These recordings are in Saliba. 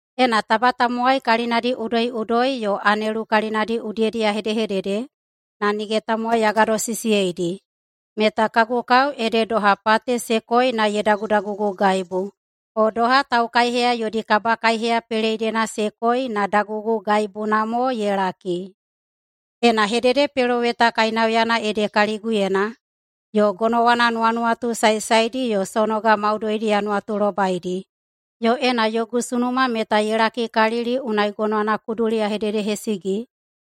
Ena taba tamowai kalinadi udoiꞌudoi yo anelu kalinadi udiyedi ya hedehedede na nige tamowai ya gadosisiyeidi, meta kagu kao ede doha pate se koi na ye dagudagugugaibu, o doha taukaiheya yodi kabakaiheya peleidena se koi na dagugugaibuna mo ye laki. Ena hededepeloweta kainauyana ede kaliguyena yo gonowana nuwanuwatu saesaedi yo sonoga maudoidi ya nuwatulobaidi, yo ena yogu sunuma meta ye lakikalili unai gonowana kuduli ya hededehesigi,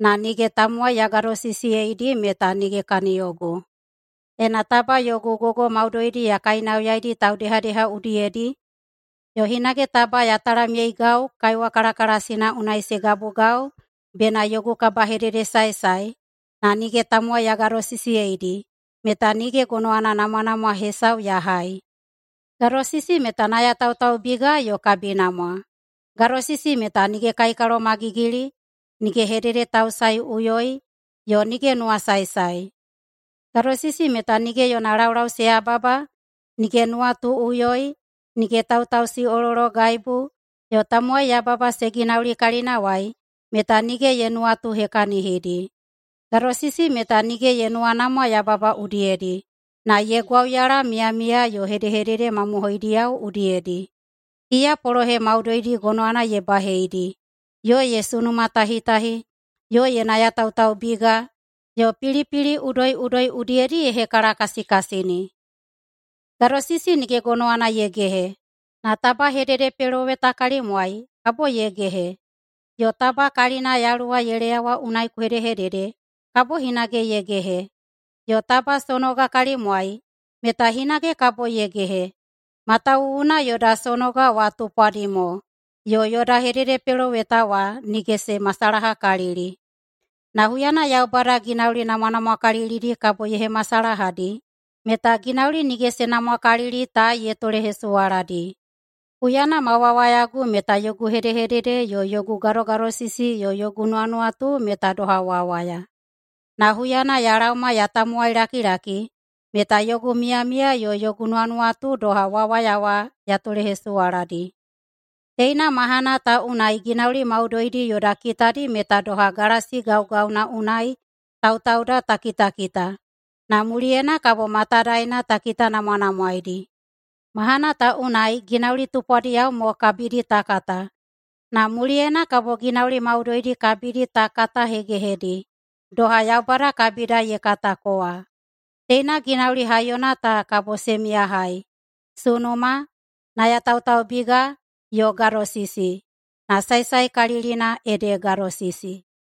na nige tamowai ya gadosisiyeidi meta nige kaniyogu. Ena taba yogu gogo maudoidi ya kainauyaidi taudehadeha udiyedi yo hinage taba ya talamyeigau kaiwa kalakalasina unai se gabugau [bena yogu kabahededesaesae], na nige tamowai ya gadosisiyeidi, meta nige gonowana namwanamwa hesau ya hai. Gadosisi meta nayatautaubiga yo kabinamwa. Gadosisi meta nige kaikalomagigili, nige hededetausaeꞌuyoi yo nige nuwasaesae. Gadosisi meta nige yona laulau se yababa, nige nuwatuꞌuyoi, nige tautausiꞌolologaibu yo tamowai yababa se ginauli kalinawai meta nige ye nuwatuhekahinidi. Gadosisi meta nige ye nuwanamwa yababa udiyedi, na ye gwauyala miyamiya yo hedehedede mamohoidiyao udiyedi. Iya polohe maudoidi gonowana ye baheidi, yo ye sunumatahitahi, yo ye nayatautaubiga, yo pilipili udoiꞌudoi udiyedi ye hekalakasikasini. Gadosisi nige gonowana ye gehe, na taba hededepeloweta kalimwai, kabo ye gehe. Yo taba kalina Yaluwa ye leyawa unai ku hedehedede, kabo hinage ye gehe. Yo taba sonoga kalimwai, meta hinage kabo ye gehe. Matawuwuna yoda sonoga wa tupwadi mo, yo yoda hededepeloweta wa nige se masalahakalili. Na huyana Yaubada ginauli namwanamwakalilidi kabo ye hemasalahadi meta ginauli nige se namwakalili ta ye tolehesuwaladi. Huyana ma wawayagu meta yogu hedehedede yo yogu gadogadosisi yo yogu nuwanuwatu meta doha wawaya. Na huyana ya laoma ya tamowailakilaki meta yogu miyamiya yo yogu nuwanuwatu doha wawaya wa ya tolehesuwaladi. Teina mahana ta unai ginauli maudoidi yoda kitadi meta doha galasi gaugauna unai tautauda ta kitakita, na muliyena kabo matadaena ta kitanamwanamwaeidi. Mahana ta unai ginauli tupwadiyao mo kabidi ta kata, na muliyena kabo ginauli maudoidi kabidi ta katahegehedi, doha Yaubada kabida ye katako wa. Teina ginauli haiyona ta kabo se miyahai: sunuma, nayatautaubiga, yo gadosisi. Na saesaekalilina ede gadosisi.